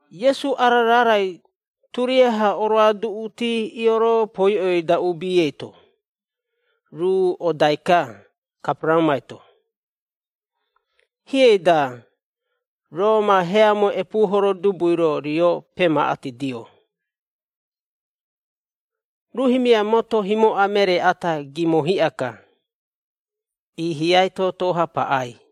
Iesu ara raarai turiaha oroaduꞌuti ioropoiꞌoi-da uubi eito, ruu odai-ka Kaperaraumai-to. Hiei-da, Roma heamoi epuuhoro dubui-ro, rio pemaꞌatidio, ruu himia moto himoꞌa meree ata, gimo hiꞌa-ka, iihiai toto-ha paꞌai.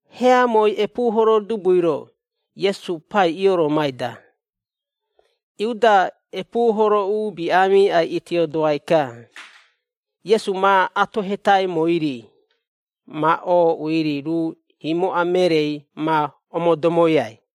Heamoi epuuhoro dubui-ro, Iesu pai ioromai-da, Iuda epuuhoro uubi aamiꞌa itiodoai-ka, Iesu ma atohetaimoi-ri, ma ooꞌui-ri ruu himoꞌa mereei ma omodomoiai.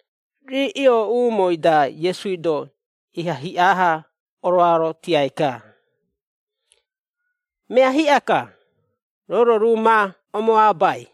Rii iooꞌumoi-da Iesui-do iha hiꞌa-ha oroarotiai-ka, “Mea hiꞌa-ka, roo-ro ruu ma omoabai.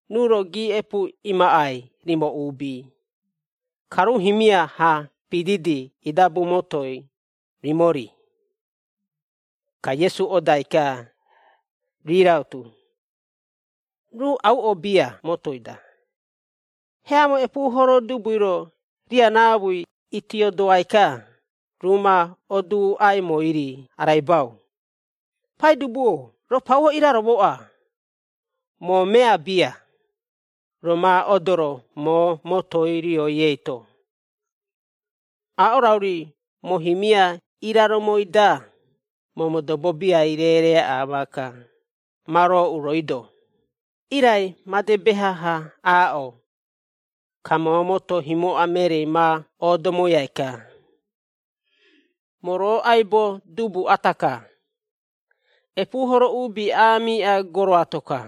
Ruu-ro giiꞌepu imaꞌai rimo uubi, ka ruu himia-ha pididi idabu motoi, rimo-ri.” Ka Iesu odai-ka, rii rautu. Ruu auꞌo bia motoi-da, heamo epuuhoro dubui-ro riaraamui itiodoai-ka, ruu ma oduuꞌaimoi-ri araibau, “Paidubu-o roo pauo iraromoꞌa, moo mea bia, roo ma odoro moo motoi rioi eito. Aaꞌo rauri, moo himia iraromoi-da, moo modobo biai reereeaꞌa maaka, ma rooꞌu rooi-do. Irai made beha-ha aaꞌo, ka moo moto himoꞌa mereei ma oodomoiai-ka. Moo roo aibo dubu ata-ka, epuuhoro uubi aamiꞌa goro ato-ka.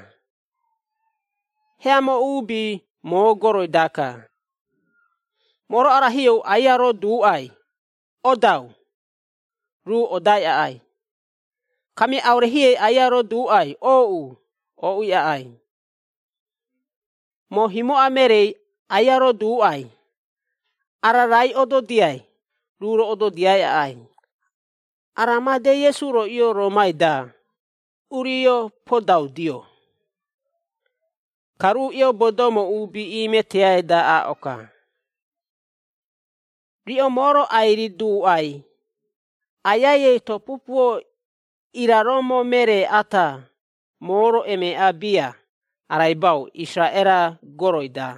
Heamo uubi moo goroi-daka. Moo-ro arahiou aia roduuꞌai, ‘Odau!’ Ruu odai aꞌai. Kamia aure hiei aia roduuꞌai, ‘Ooꞌu,’ ooꞌui aꞌai. Moo himoꞌa mereei aia roduuꞌai ‘Ara raai ododiai,’ ruu-ro ododiai aꞌai.” Ara madei Iesu-ro ioroomai-da urio podaudio. Ka ruu iobodoumo uubi iimeteai-da aaꞌo-ka, “Riꞌo moo-ro ai-riduuꞌai, Aiai eito pupuo iraromo meree ata, moo-ro, emeeꞌa bia araibau Isaraꞌera goroi-da.”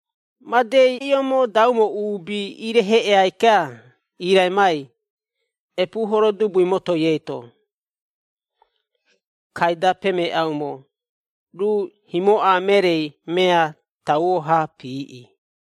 Madei iomodaumo uubi ireheꞌeai-ka, iiraimai epuuhoro dubui motoi eito. Kaida pemeeꞌaumo ruu himoꞌa mereei mea tauo-ha piiꞌi.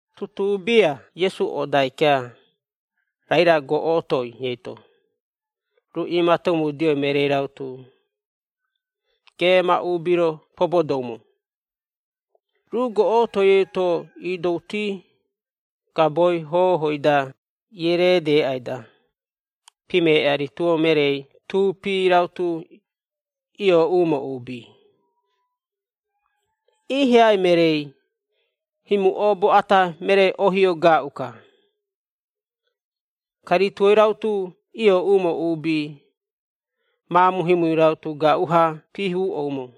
Tutuu bia Iesu odai-ka, Raira goꞌotoi eito, ruu iimatomudio mereei rautu, geema uubi-ro pobodoumo. Ruu goꞌotoi eito iidouti gaboi hohoi-da iereedeeꞌai-da, pimeeꞌa rituo mereei tuupi rautu, iooꞌumo uubi. Iihiai mereei, himu oobo ata, meree-ohio gaaꞌu-ka, ka rituoi rautu iooꞌumo uubi, maamu himui rautu gaaꞌu-ha piihuuꞌoumo.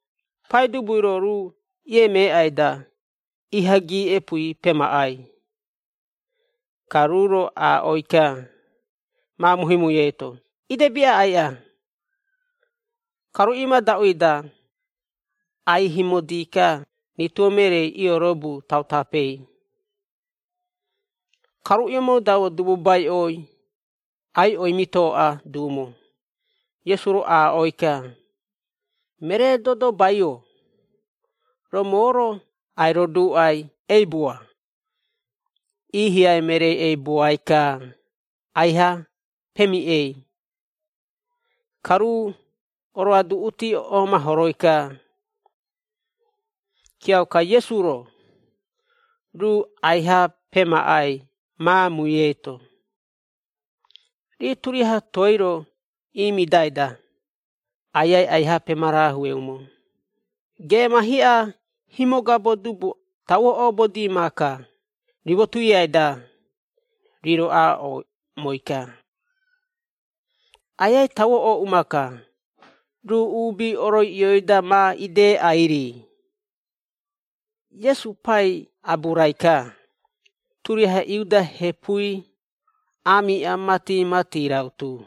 Paidubui-ro ruu iemeeꞌai-da, iha giiꞌepui pemaꞌai, ka ruu-ro aaꞌoi-ka, maamu himui eito, “Idebi aꞌaiꞌa.” Ka ruu imadaꞌui-da, aihimodi-ka rituo mereei iorobu tautapei. Ka iomodaumo dububaiꞌoi aiꞌoi mitooꞌa duumo. Iesu-ro aaꞌoi-ka, “Meree dodobai-o, roo moo-ro ai-roduuꞌai, eibua.” Iihiai mereei eibuai-ka, aiha pemiꞌei, ka ruu oroaduꞌuti oomahoroi-ka. Kiauka Iesu-ro, ruu aiha pemaꞌai maamui eito. Rii turiaha toei-ro imidai-da, Aiai aiha pemarahueumo, “Geema hiꞌa himogabo dubu tauo oobodi maaka, rimo tuiai-da.” Rii-ro aaꞌoumoi-ka, “Aiai tauo ooꞌu maaka, ruu uubi oroiꞌioi-da ma ideꞌai-ri.” Iesu pai aburai-ka, turiaha Iudea hepui, aamiꞌa mati-mati rautu.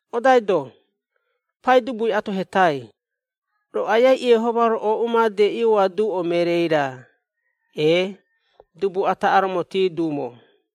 Odaido, Paidubui atohetai, “Roo Aiai Iehoma-ro ooꞌu made ioaduꞌo mereei-ra, ee, dubu ata aromoti duumo?”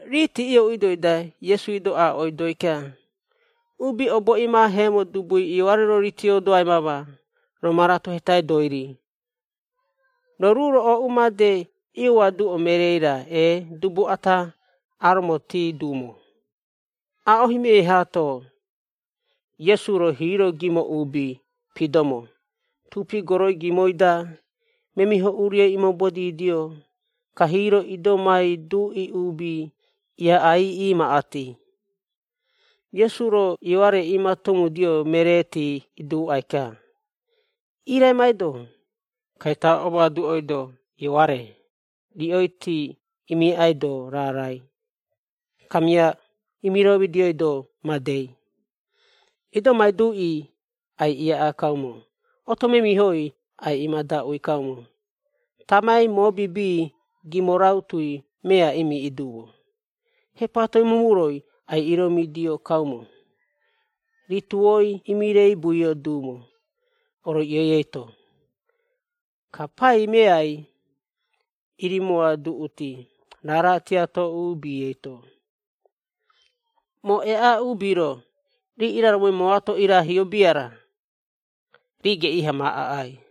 Riiti iooꞌuidoi-da Iesui-do aaꞌoidoi-ka, “Uubi obo imaaheemo dubui, Ioare-ro, riitiodoai mama, roo ma ratohetaidoi-ri, ‘Roo ruu-ro ooꞌu made ioaduꞌo mereei-ra, ee, dubu ata aromotii duumo?’” Aaꞌo himioi haato, Iesu-ro hiiro gimo uubi pidomo, tuupi goroi gimoi-da, memiho urioi iimobodidio, ka hiiro idomai duꞌi uubi, iaꞌai iimaꞌati. Iesu-ro Ioare iimatomudio mereeti iduuꞌai-ka, “Iraimaido, ka ita omoaduoido Ioare, riꞌoiti imiaꞌaido raarai, kamia imiromidioido madei, idomai duꞌi, ai-iaꞌaa kaumo, oto memihoi ai-imadaꞌui kaumo, tamai mobibi gimo rautui, mea imiiꞌi duumo, hepatoi mumuroi, ai-iromidio kaumo, rituoi imireibuio duumo, oroiꞌioi eito, ka pai meai, irimoaduꞌuti, raara tiato uubi eito. Moo eaꞌa uubi-ro, rii iraromoi mooato irahio bia-ra, rii geꞌii-ha ma aꞌai.”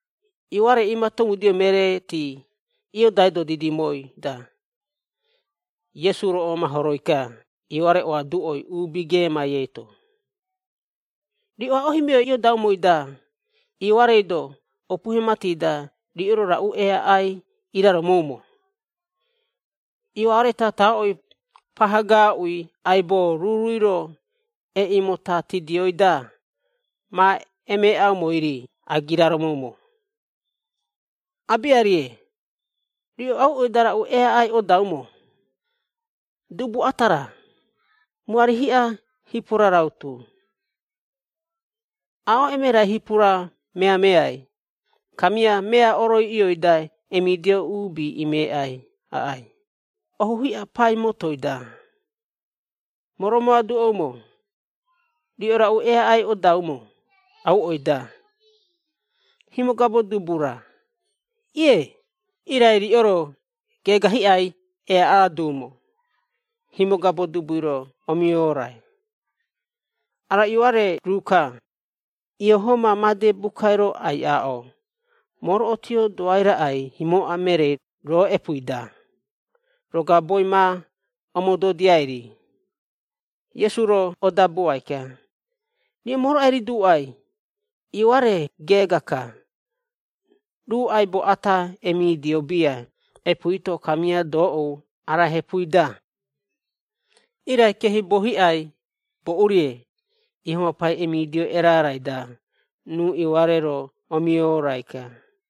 Ioare iimatomudio mereeti iodaido didimoi-da, Iesu-ro omahoroi-ka Ioare oaduꞌoi uubi geemai eito, “Riꞌo aaꞌo himioi iodaumoi-da Ioarei-do, opuhe mati-da, riꞌo-ro raꞌu eaꞌai iraromoumo? Ioare tataꞌoi paha gaaꞌu aibo, ruurui-ro eꞌimotatidioi-da, ma emeeꞌaumoi-ri agiraromoumo? Aabiarie. Riꞌo auꞌoi-da raꞌu eaꞌai odaumo? Dubu ata-ra, muari hiꞌa hipura rautu? Aaꞌo emerai hipura meameai, kamia mea oroiꞌioi-da emidio uubi imeꞌai aꞌai, ohu hiꞌa pai motoi-da! Moo romoaduꞌoumo, riꞌo raꞌu eaꞌai odaumo auꞌoi-da? Himogabo dubu-ra? Ie, iaha-ka, irai riꞌo-ro geega hiꞌai eaꞌa duumo, himogabo dubui-ro omiorai. Ara Ioare ruu-ka, Iehoma made bukai-ro ai-aaꞌo: ‘Moo-ro otiodoai raꞌai himoꞌa mereei, roo epuui-da, roo gaboi ma omododia-ri.’” Iesu-ro odabuai-ka, “Riꞌo moo-ro ai-riduuꞌai, Ioare geega-ka, ruu aibo ata, emidio bia epuui-to, kamia doꞌou, ara hepui-da. Irai keehibuo hiꞌai boꞌu-rie, Iehoma pai emidio erarai-da, ruu Ioare-ro omiorai-ka.”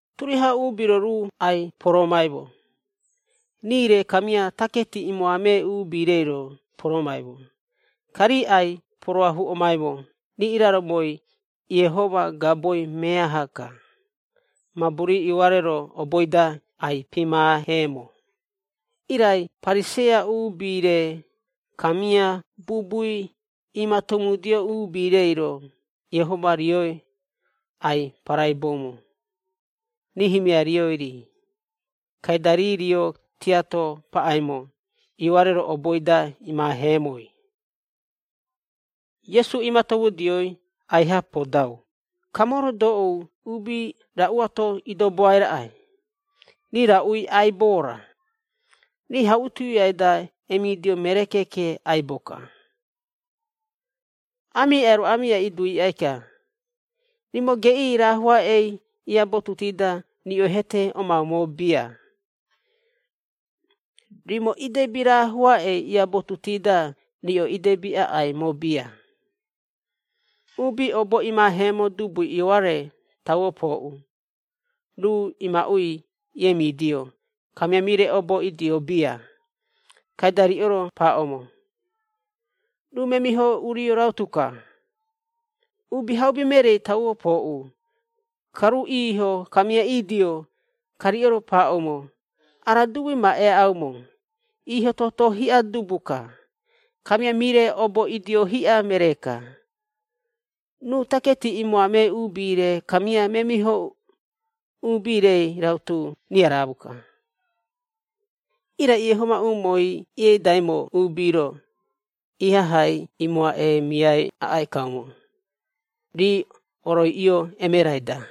Turiaha uubi-ro ruu ai-poroomaimo, rii-re kamia taketi imoamee uubi-reiro poromaimo, ka rii ai-poroahuomaimo, rii iraromoi Iehoma gaboi meaha-ka mabu rii Ioare-ro oboi-da ai-pimaaheemo. Irai Pariseia uubi-re kamia bubui imatomudio uubi-reiro Iehoma rioi ai-paraiboumo, rii himia rioi-ri, kaida rii rio tiato paꞌaimo, Ioare-ro, oboi-da imaaheemoi. Iesu imatomudioi aiha podau, “Ka moo-ro doꞌou uubi raꞌuato idoboai raꞌai? Rii raꞌui aibo-ra? Rii hauꞌi tuiai-da emidio meree keeke aibo-ka. Aamiꞌai-ro aamiꞌai iduuꞌai-ka, ‘Rimo geꞌii raahoaꞌei iabotuti-da, riꞌo hete omaumo bia! Rimo idebi raahoaꞌei iabotuti-da, riꞌo idebi aꞌaimo bia!’ Uubi obo imaaheemo dubui Ioare tauo pooꞌu, ruu imaꞌui iemidio kamia mire obo idio bia. Kaida riꞌo-ro paaꞌoumo, ‘Ruu memiho urio rautu-ka!’ Uubihaubi mereei tauo pooꞌu, ka ruu iiho kamia idio, ka riꞌo-ro paaꞌoumo, ‘Ara dubui ma eaꞌaumo, iiho-toto hiꞌa dubu-ka, kamia mire obo idio hiꞌa meree-ka. Ruu taketi imoamee uubi-re kamia memiho uubi-rei rautu, riaraamu-ka.’ Irai Iehoma umooi ieidaimo uubi-ro, ihahai imoaꞌeemiai aꞌai kaumo, rii oroiꞌio emerai-da.”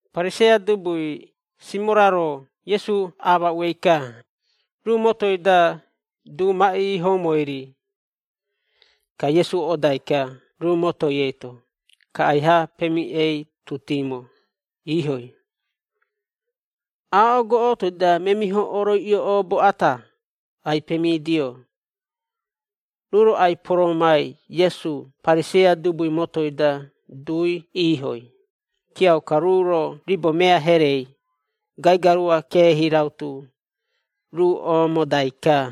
Pariseia dubui Simora-ro Iesu amaꞌuei-ka, ruu motoi-da du ma iihoumoi-ri. Ka Iesu odai-ka ruu motoi eito. Ka aiha pemiꞌeitutimo, iihoi. Aaꞌo goꞌotoi-da memiho oroiꞌio oobo ata, ai-pemidio. Ruu-ro ai-poroomai Iesu Pariseia dubui motoi-da dui iihoi, kiauka ruu-ro ribo mea herei, gaigarua keehi rautu, ruu oomodai-ka.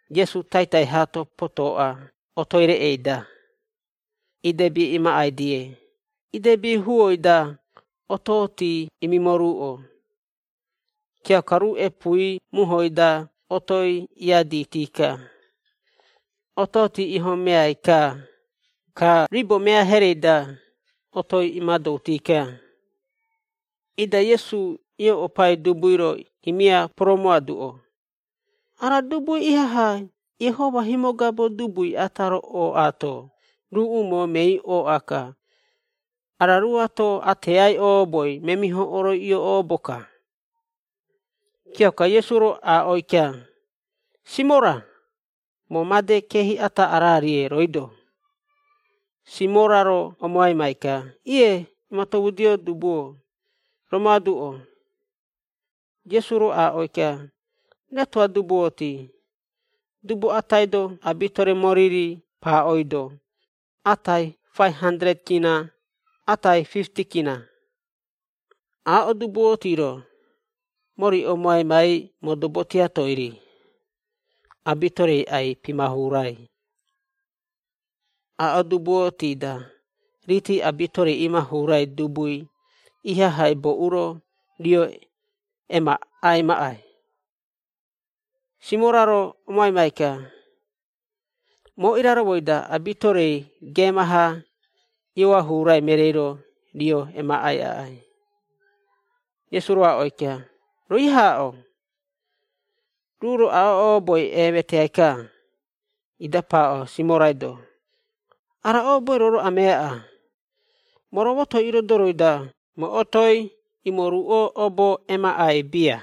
Iesu taitai haato potoꞌa otoi reꞌei-da, idebi imaꞌai-die idebi huoi-da otooti imimoruꞌo. Kiauka ruu epuui muhoi-da otoi iaditi-ka, otooti ihomeai-ka, ka ribo mea herei-da otoi imadouti-ka. Ida Iesu ioꞌopai dubui-ro himia poromoaduꞌo, “Ara dubui ihaha Iehoma himogabo dubui ata-ro ooꞌaato, ruu umoo mei ooꞌa-ka ara ruuato ateai ooboi memiho oroiꞌio oobo-ka.” Kiauka Iesu-ro aaꞌoi-ka, “Simora, moo made keehi ata ararie rooi-do.” Simora-ro omoaimai-ka, “Ie, imatomudio dubu-o, romoaduꞌo.” Iesu-ro aaꞌoi-ka, “Retoꞌa dubuoti, dubu atai-do abitore mori-ri paaꞌoido, atai K500, atai K50. Aaꞌo dubuoti-ro, mori omoaimai modobo tiatoi-ri, abitorei ai-pimahurai. Aaꞌo dubu oti-da, rii abitorei imahurai dubui, ihaha boꞌu-ro rio emaꞌai maꞌai?” Simora-ro omoaimai-ka, “Moo iraromoi-da abitorei geema-ha ioahurai mereei-ro rio emaꞌai aꞌai.” Iesu-ro aaꞌoi-ka, “Roo iaha aaꞌo.” Ruu-ro aaꞌo ooboi eemeteai-ka, ida paaꞌo Simorai-do, “Ara ooboi roo-ro ameaꞌa? Moo roo motoi irodoroi-da, moo otoi imoruꞌo obo emaꞌai bia.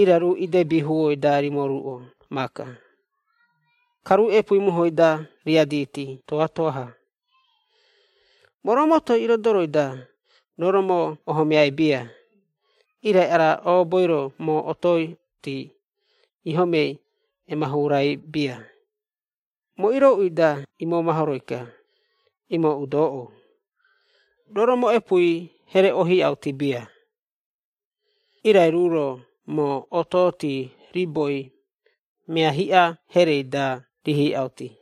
Irai ruu idebi huoi-da rimoruꞌo maaka, ka ruu epuui muhoi-da riaditi toatoa-ha. Moo, roo motoi irodoroi-da, roo-ro moo ohomeai bia, irai ara ooboi-ro, moo ototi ihomei emahurai bia, moo irooꞌui-da imomahoroi-ka, imooꞌu doꞌou. Roo-ro moo epuui here ohiꞌauti bia. Irai ruu-ro moo ototi riboi mea hiꞌa herei-da rihiꞌauti.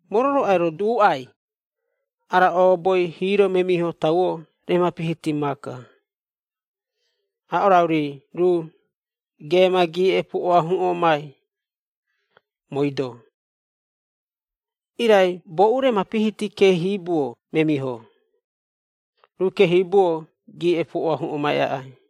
Moo-ro, roo ai-roduuꞌai, ara ooboi, hiiro memiho tauo remapihiti maaka. Aaꞌo rauri, ruu geema giiꞌepu oahuꞌomai, mooi-do. Irai boꞌu remapihiti keehibuo memiho, ruu keehibuo giiꞌepu oahuꞌomai aꞌai.”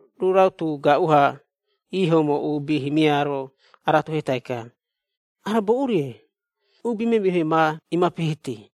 Ruu rautu gaaꞌu-ha iihoumo uubi himia-ro aratohetai-ka, “Ara boꞌu-rie, uubi memihoi ma imapihiti?”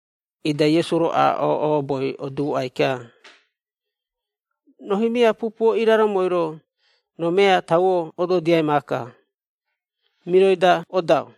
Ida Iesu-ro aaꞌo ooboi oduuꞌai-ka, “Roo himia pupuo iraromoi-ro, roo mea tauo ododiai maaka. Miroi-da odau.”